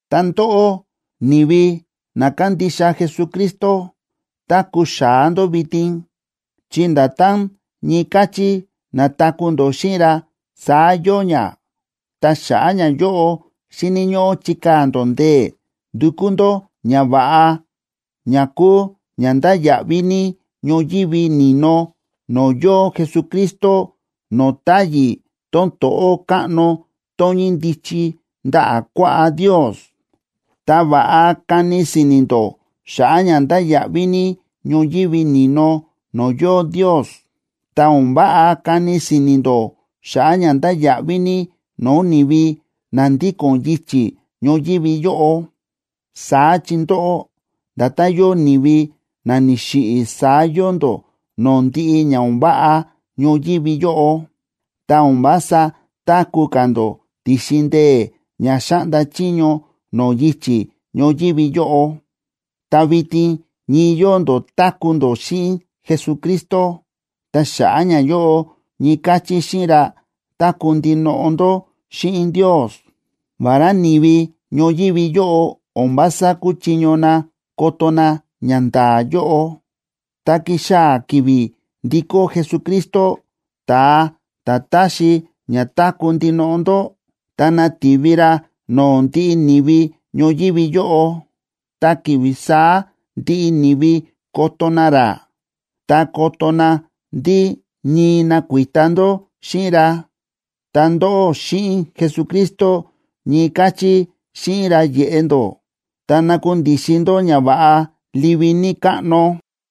Ta ndóꞌó, ni̱vi na kándixa Jesucristo, táku̱ xa̱á ndó vitin, chi nda̱tán ñii káchí na̱taku̱ ndó xíꞌin ra, saá yóo ña. Ta xa̱ꞌa̱ ñayóꞌo xíni̱ ñóꞌó chikaa̱ ndó ndee̱ ndukú ndó ñava̱ꞌa ña kúu ña ndáya̱ꞌví ní ñoyívi ni̱no no̱o̱ yóo Jesucristo no̱o̱ táyi̱ tón to̱ꞌó káꞌno tón ñíndichi ndaꞌa̱ kuaꞌá Ndios. Ta va̱ꞌa kani si̱ni̱ ndó xa̱ꞌa̱ ña ndáya̱ꞌví ní ñoyívi ni̱no no̱o̱ yóo Ndios, ta o̱n váꞌa kani si̱ni̱ ndó xa̱ꞌa̱ ña ndáya̱ꞌví ní no̱o̱ ni̱vi na ndíko̱n yichi̱ ñoyívi yóꞌo. Saá chi ndóꞌó, nda̱tán yóo ni̱vi na ni̱xiꞌi̱ saá yóo ndó no̱o̱ ndiꞌi ña o̱n váꞌa ñoyívi yóꞌo, ta o̱n vása táku̱ ka̱ ndó ti̱xin ndee̱ ña xáꞌnda chiño no̱o̱ yichi̱ ñoyívi yóꞌo, ta vitin ñii yóo ndó táku̱ ndó xíꞌin Jesucristo. Ta xa̱ꞌa̱ ñayóꞌo, ñii káchí xíꞌin ra, táku̱ ndinoꞌo ndó xíꞌin Ndios, vará ni̱vi ñoyívi yóꞌo o̱n vása kúchiño na koto na ñanda̱a̱ yóꞌo. Tá kixaa̱ ki̱vi̱ ndikó Jesucristo, ta̱a ta̱ táxi ña táku̱ ndinoꞌo ndó, ta nativi ra no̱o̱ ndiꞌi ni̱vi ñoyívi yóꞌo. Ta ki̱vi̱ saá ndiꞌi ni̱vi koto na ra, ta koto na ndí ñii nakuita ndó xíꞌin ra. Ta ndóꞌó xíꞌin Jesucristo, ñii káchí xíꞌin ra yeꞌe ndó ta nakundixin ndó ñava̱ꞌa livi ní káꞌno.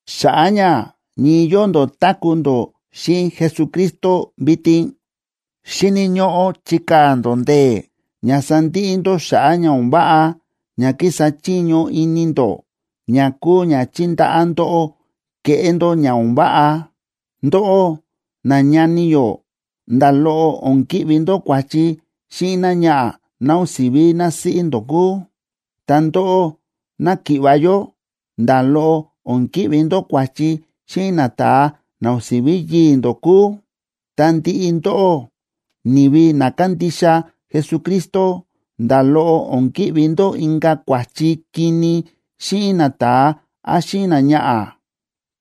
Xa̱ꞌa̱ ña ñii yóo ndó táku̱ ndó xíꞌin Jesucristo vitin, xíni̱ ñóꞌó chikaa̱ ndó ndee̱ ña sandiꞌi ndó xa̱ꞌa̱ ña o̱n váꞌa ña kísa chiño ini ndó ña kúu ña chíndaꞌá ndóꞌó keꞌé ndó ña o̱n váꞌa. Ndóꞌó nañani yó, nda̱ loꞌo o̱n ki̱ꞌvi ndó kua̱chi xíꞌin náñaꞌa̱ ná o̱n si̱ví násíꞌí ndó kúu, ta ndóꞌó náki̱ꞌva̱ yó, nda̱ loꞌo o̱n ki̱ꞌvi ndó kua̱chi xíꞌin nata̱a, na o̱n si̱ví yii̱ ndó kúu. Ta ndiꞌi ndóꞌó, ni̱vi na kándixa Jesucristo, nda̱ loꞌo o̱n ki̱ꞌvi ndó inka̱ kua̱chi kini xíꞌin nata̱a án xíꞌin náñaꞌa̱,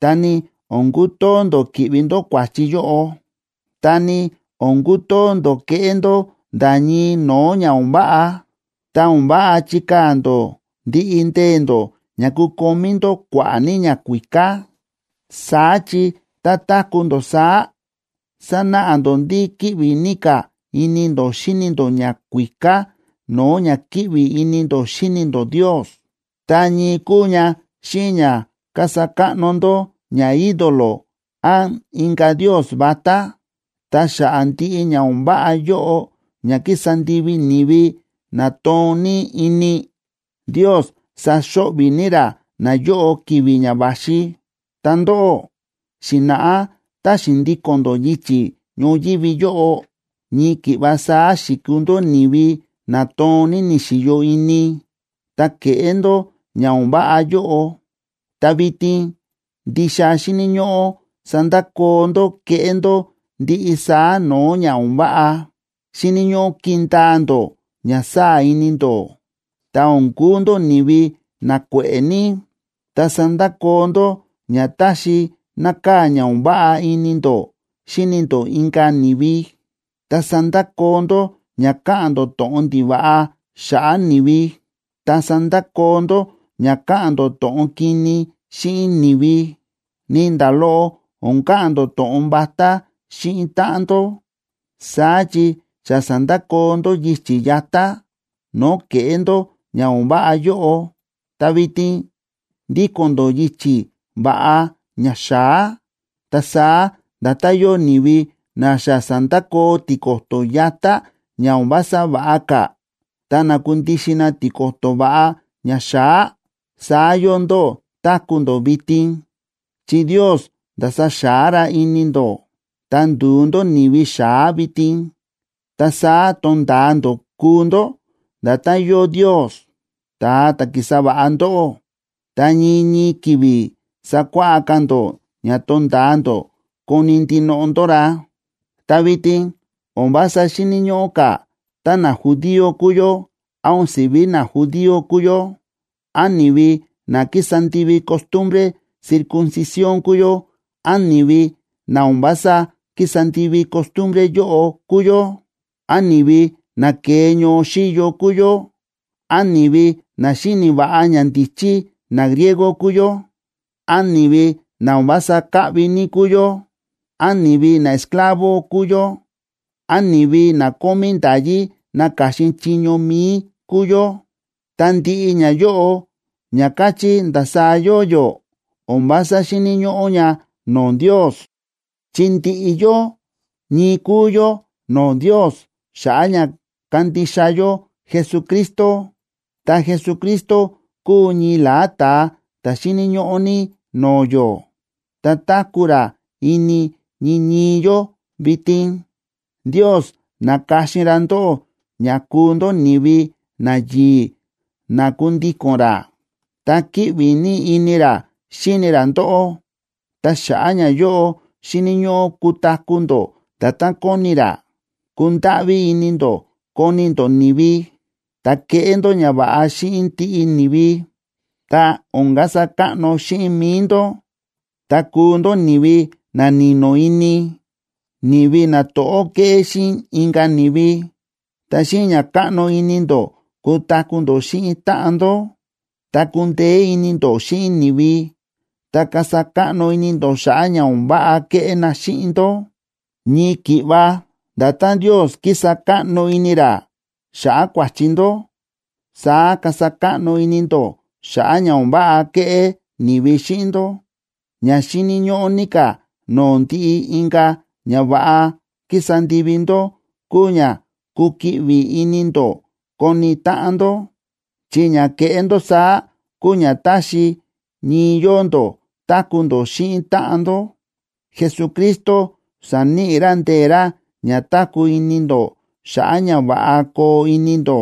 ta ni o̱n kutoo ndó ki̱ꞌvi ndó kua̱chi yóꞌo. Ta ni o̱n kutoo ndó keꞌé ndó nda̱ ñii no̱o̱ ña o̱n váꞌa. Ta o̱n váꞌa chikaa̱ ndó ndiꞌi ndee̱ ndó ña kukomí ndó kua̱ꞌa̱ ní ñakuíká. Saá chi tá táku̱ ndó saá, sánáꞌa ndó ndí kíꞌvi ní ka̱ ini ndó xíni ndó ñakuíká no̱o̱ ña kíꞌvi ini ndó xíni ndó Ndios, ta ñii kúu ña xíꞌin ña kasa káꞌno ndó ñaídolo án inka̱ ndios vatá. Ta xa̱ꞌa̱ ndiꞌi ña o̱n váꞌa yóꞌo ña kísa ndivi ni̱vi na toon ní ini, Ndios saxo̱ꞌvi̱ ní ra nayóꞌo ki̱vi̱ ña va̱xi. Ta ndóꞌó, xi̱na̱ꞌá tá xi̱ndíko̱n ndó yichi̱ ñoyívi yóꞌo, ñii ki̱ꞌva saá xi̱kuu ndó ni̱vi na toon ní ni̱xi̱yo ini, ta ke̱ꞌé ndó ña o̱n váꞌa yóꞌo. Ta vitin ndixa xíni̱ ñóꞌó sandakoo ndó kéꞌé ndó ndiꞌi saá no̱o̱ ña o̱n váꞌa. Xíni̱ ñóꞌó kindaa ndó ña sáa̱ ini ndó, ta o̱n kuu ndó ni̱vi na kue̱ꞌe̱ ní. Ta sandakoo ndó ña táxi nákaa̱ ña o̱n váꞌa ini ndó xíni ndó inka̱ ni̱vi, ta sandakoo ndó ña káꞌa̱n ndó to̱ꞌon ndiva̱ꞌa xa̱ꞌa̱ ni̱vi, ta sandakoo ndó ña káꞌa̱n ndó to̱ꞌon kini xíꞌin ni̱vi. Ni nda̱ loꞌo o̱n ka̱ꞌa̱n ndó to̱ꞌon vatá xíꞌin táꞌan ndó. Saá chi xa sa̱ndakoo ndó yichi̱ yatá, no̱o̱ ke̱ꞌé ndó ña o̱n váꞌa yóꞌo, ta vitin ndíko̱n ndó yichi̱ va̱ꞌa ña xa̱á. Ta saá nda̱tán yóo ni̱vi na xa sa̱ndakoo tiko̱to̱ yatá ña o̱n vása va̱ꞌa ka̱, ta na̱kundixin na tiko̱to̱ va̱ꞌa ñaxa̱á, saá yóo ndó táku̱ ndó vitin, chi Ndios nda̱sa xa̱á ra ini ndó, ta ndu̱u ndó ni̱vi xa̱á vitin. Ta saá tonda̱a ndó kuu ndó nda̱tán yóo Ndios, ta̱a ta̱ ki̱sa va̱ꞌa ndóꞌó, ta ñii ñii ki̱vi̱ sákuáꞌá ka̱ ndó ña tonda̱a ndó koni̱ ndinoꞌo ndó ra. Ta vitin o̱n vása xíni̱ ñóꞌó ka̱ tá najudío kúu yó, án o̱n si̱ví najudío kúu yó, án ni̱vi na kísa ndivi costumbre circuncisión kúu yó, án ni̱vi na o̱n vása kísa ndivi costumbre yóꞌo kúu yó, án ni̱vi na ke̱e ñoo xíyo kúu yó, án ni̱vi na xíni̱ va̱ꞌa ñandíchí nagriego kúu yó, án ni̱vi na o̱n vása káꞌvi ní kúu yó, án ni̱vi naesclavo kúu yó, án ni̱vi na kómí nda̱yí naka̱xin chiño mi̱i kúu yó, ta ndiꞌi ñayóꞌo ña káchí ndasaá yóo yó o̱n vása xíni̱ ñóꞌó ña no̱o̱ Ndios, chi ndiꞌi yó ñii kúu yó no̱o̱ Ndios xa̱ꞌa̱ ña kándixa yó Jesucristo. Ta Jesucristo kúu ñii la̱á ta̱a ta̱ xíni̱ ñóꞌó ní no̱o̱ yó, ta táku̱ ra ini ñii ñii yó vitin. Ndios na̱ka̱xin ra ndóꞌó ña kuu ndó ni̱vi nayi̱i̱ na kundíko̱n ra, ta kíꞌvi ní ini ra xíni ra ndóꞌó. Ta xa̱ꞌa̱ ñayóꞌo xíni̱ ñóꞌó kutaku̱ ndó nda̱tán kóni ra. Kundáꞌví ini ndó koni ndó ni̱vi, ta keꞌé ndó ñava̱ꞌa xíꞌin ndiꞌi ni̱vi. Ta o̱n kasa káꞌno xíꞌin mi̱i ndó, ta kuu ndó ni̱vi na ni̱no̱ ini, ni̱vi na to̱ꞌó kéꞌé xíꞌin inka̱ ni̱vi, ta xíꞌin ña káꞌno ini ndó kutaku̱ ndó xíꞌin táꞌan ndó. Ta kundeé ini ndó xíꞌin ni̱vi, ta kasa káꞌno ini ndó xa̱ꞌa̱ ña o̱n váꞌa kéꞌé na xíꞌin ndó. Ñii ki̱ꞌva nda̱tán Ndios kísa káꞌno ini ra xa̱ꞌa̱ kua̱chi ndó, saá kasa káꞌno ini ndó xa̱ꞌa̱ ña o̱n váꞌa kéꞌé ni̱vi xíꞌin ndó. Ña xíni̱ ñóꞌó ní ka̱ no̱o̱ ndiꞌi inka̱ ñava̱ꞌa kísa ndivi ndó kúu ña kukiꞌvi ini ndó koni táꞌan ndó, chi ña kéꞌé ndó saá kúu ña táxi ñii yóo ndó táku̱ ndó xíꞌin táꞌan ndó. Jesucristo sa̱níꞌi ra ndee̱ ra ña táku̱ ini ndó xa̱ꞌa̱ ña va̱ꞌa koo ini ndó,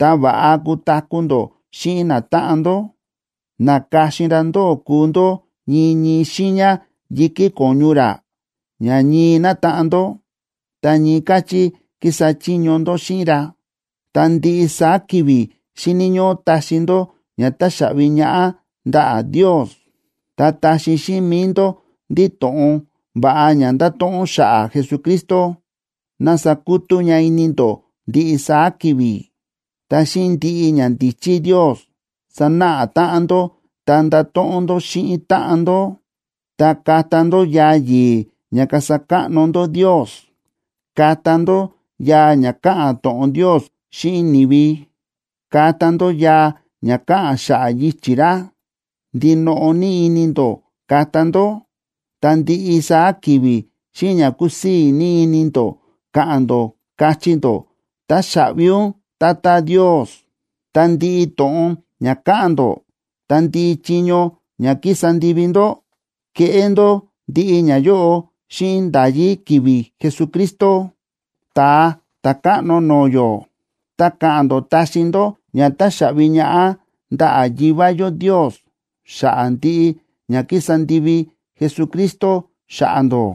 ta va̱ꞌa kutaku̱ ndó xíꞌin natáꞌan ndó. Na̱ka̱xin ra ndóꞌó kúu ndó ñii ñii xiiña yi̱kí ko̱ñu ra, ña ñii nátaꞌan ndó, ta ñii káchí kísa chiño ndó xíꞌin ra. Ta ndiꞌi saá ki̱vi̱ xíni̱ ñóꞌó taxi ndó ña táxaꞌvi ñaꞌá ndaꞌa̱ Ndios. Ta taxi xíꞌin mi̱i ndó ndí to̱ꞌon va̱ꞌa ña ndáto̱ꞌon xa̱ꞌa̱ Jesucristo ná sakutú ña ini ndó ndiꞌi saá ki̱vi̱. Ta xíꞌin ndiꞌi ñandíchí Ndios, sanáꞌa táꞌan ndó ta ndato̱ꞌon ndó xíꞌin táꞌan ndó. Ta kata ndó yaa yi̱i̱ ña kasa káꞌno ndó Ndios, kata ndó yaa ña káꞌa̱n to̱ꞌon Ndios xíꞌin ni̱vi, ta kata ndó yaa ña káꞌa̱n xa̱ꞌa̱ yichi̱ ra. Ndinoꞌo ní ini ndó kata ndó, ta ndiꞌi saá ki̱vi̱ xíꞌin ña kusii̱ ní ini ndó ka̱ꞌa̱n ndó, kachí ndó: “Táxaꞌvi ún, Tata Ndios.” Ta ndiꞌi to̱ꞌon ña káꞌa̱n ndó ta ndiꞌi chiño ña kísa ndivi ndó, keꞌé ndó ndiꞌi ñayóꞌo xíꞌin nda̱yí ki̱vi̱ Jesucristo, Ta̱a Ta̱káꞌno no̱o̱ yó. Ta ka̱ꞌa̱n ndó taxi ndó ña táxaꞌvi ñaꞌá ndaꞌa̱ Yivá yó Ndios xa̱ꞌa̱ ndiꞌi ña kísa ndivi Jesucristo xa̱ꞌa̱ ndó.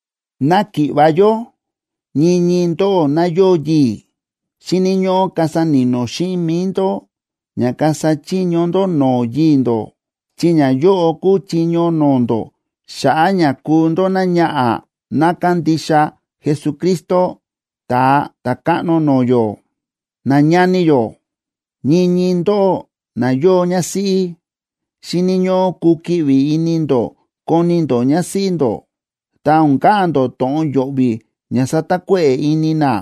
Náki̱ꞌva̱ yó, ñii ñii ndóꞌó ná yóo yii̱, xíni̱ ñóꞌó kasa ni̱no̱ xíꞌin mi̱i ndó ña kasa chiño ndó no̱o̱ yii̱ ndó, chi ñayóꞌo kúu chiño no̱o̱ ndó xa̱ꞌa̱ ña kúu ndó náñaꞌa̱ ná kándixa Jesucristo, Ta̱a Ta̱káꞌno no̱o̱ yó. Nañani yó, ñii ñii ndóꞌó na yóo ñásíꞌí, xíni̱ ñóꞌó kukiꞌvi ini ndó koni ndó ñásíꞌí ndó, ta o̱n ka̱ꞌa̱n ndó to̱ꞌon yo̱ꞌvi̱ ña satakuéꞌe̱ ini ná.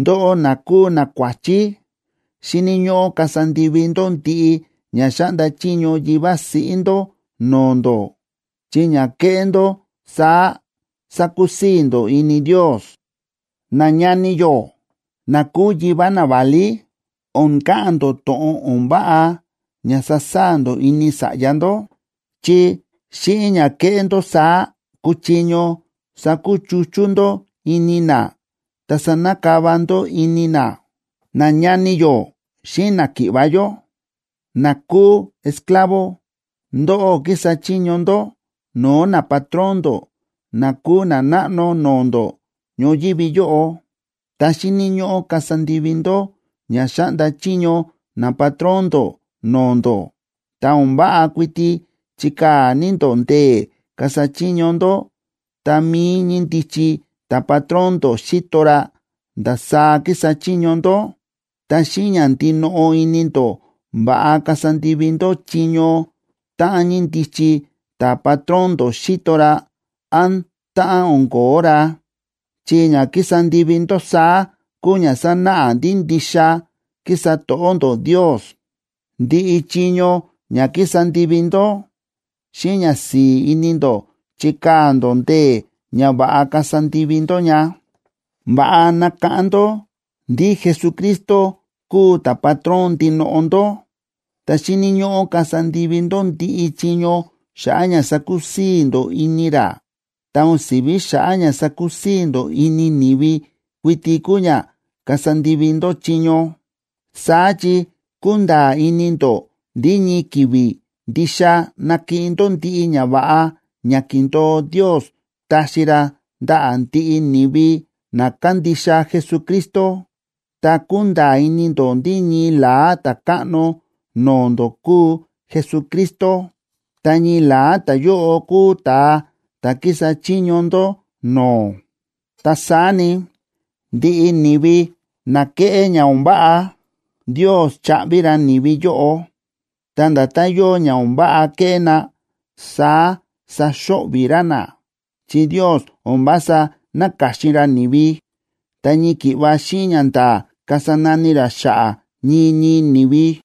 Ndóꞌó na kúu nakuáchí, xíni̱ ñóꞌó kasa ndivi ndó ndiꞌi ña xáꞌnda chiño yivá siꞌí ndó no̱o̱ ndó, chi ña kéꞌé ndó saá sakusii̱ ndó ini Ndios. Nañani yó na kúu yivá naválí, o̱n ka̱ꞌa̱n ndó to̱ꞌon o̱n váꞌa ña sasaa̱ ndó ini sa̱ꞌya ndó. Chi xíꞌin ña keꞌé ndó saá kuchiño sakuchuchú ndó ini na, ta sanakava ndó ini na. Nañani yó xíꞌin náki̱ꞌva̱ yó na kúu esclavo, ndóꞌó kísa chiño ndó no̱o̱ napatrón ndó na kúu nanáꞌno no̱o̱ ndó ñoyívi yóꞌo, ta xíni̱ ñóꞌó kasa ndivi ndó ña xáꞌnda chiño napatrón ndó no̱o̱ ndó. Ta o̱n váꞌa kuiti chikaa̱ ní ndó ndee̱ kasa chiño ndó tá mií ñíndichi ta̱patrón ndó xíto ra ndasaá kísa chiño ndó, ta xíꞌin ña ndinoꞌo ini ndó va̱ꞌa kasa ndivi ndó chiño táꞌan ñíndichi ta̱patrón ndó xíto ra, án táꞌan o̱n ko̱ó ra, chi ña kísa ndivi ndó saá kúu ña sánáꞌa ndí ndixa kísa to̱ꞌó ndó Ndios. Ndiꞌi chiño ña kísa ndivi ndó, xíꞌin ñasi̱i̱ ini ndó chikaa̱ ndó ndee̱ ña va̱ꞌa kasa ndivi ndó ña. Va̱ꞌa nakáꞌán ndó ndí Jesucristo kúu ta̱patrón ndinoꞌo ndó, ta xíni̱ ñóꞌó kasa ndivi ndó ndiꞌi chiño xa̱ꞌa̱ ña sakusii̱ ndó ini ra, ta o̱n si̱ví xa̱ꞌa̱ ña sakusii̱ ndó ini ni̱vi kuiti kúu ña kasa ndivi ndó chiño. Saá chi kúnda̱a̱ ini ndó ndí ñii ki̱vi̱ ndixa nakiꞌin ndó ndiꞌi ñava̱ꞌa ña ki̱ndo̱o Ndios taxi ra ndaꞌa̱ ndiꞌi ni̱vi na kándixa Jesucristo. Ta kúnda̱a̱ ini ndó ndí ñii la̱á Ta̱káꞌno no̱o̱ ndó kúu Jesucristo, ta ñii la̱á ta̱yóꞌo kúu ta̱a ta̱ kísa chiño ndó no̱o̱. Ta saá ni, ndiꞌi ni̱vi na kéꞌé ña o̱n váꞌa, Ndios chaꞌvi ra ni̱vi yóꞌo. Ta nda̱tán yóo ña o̱n váꞌa ke̱ꞌé na, saá saxo̱ꞌvi̱ ra na, chi Ndios o̱n vása náka̱xin ra ni̱vi, ta ñii ki̱ꞌva xíꞌin ñanda̱a̱ kasa nani ra xa̱ꞌa̱ ñii ñii ni̱vi.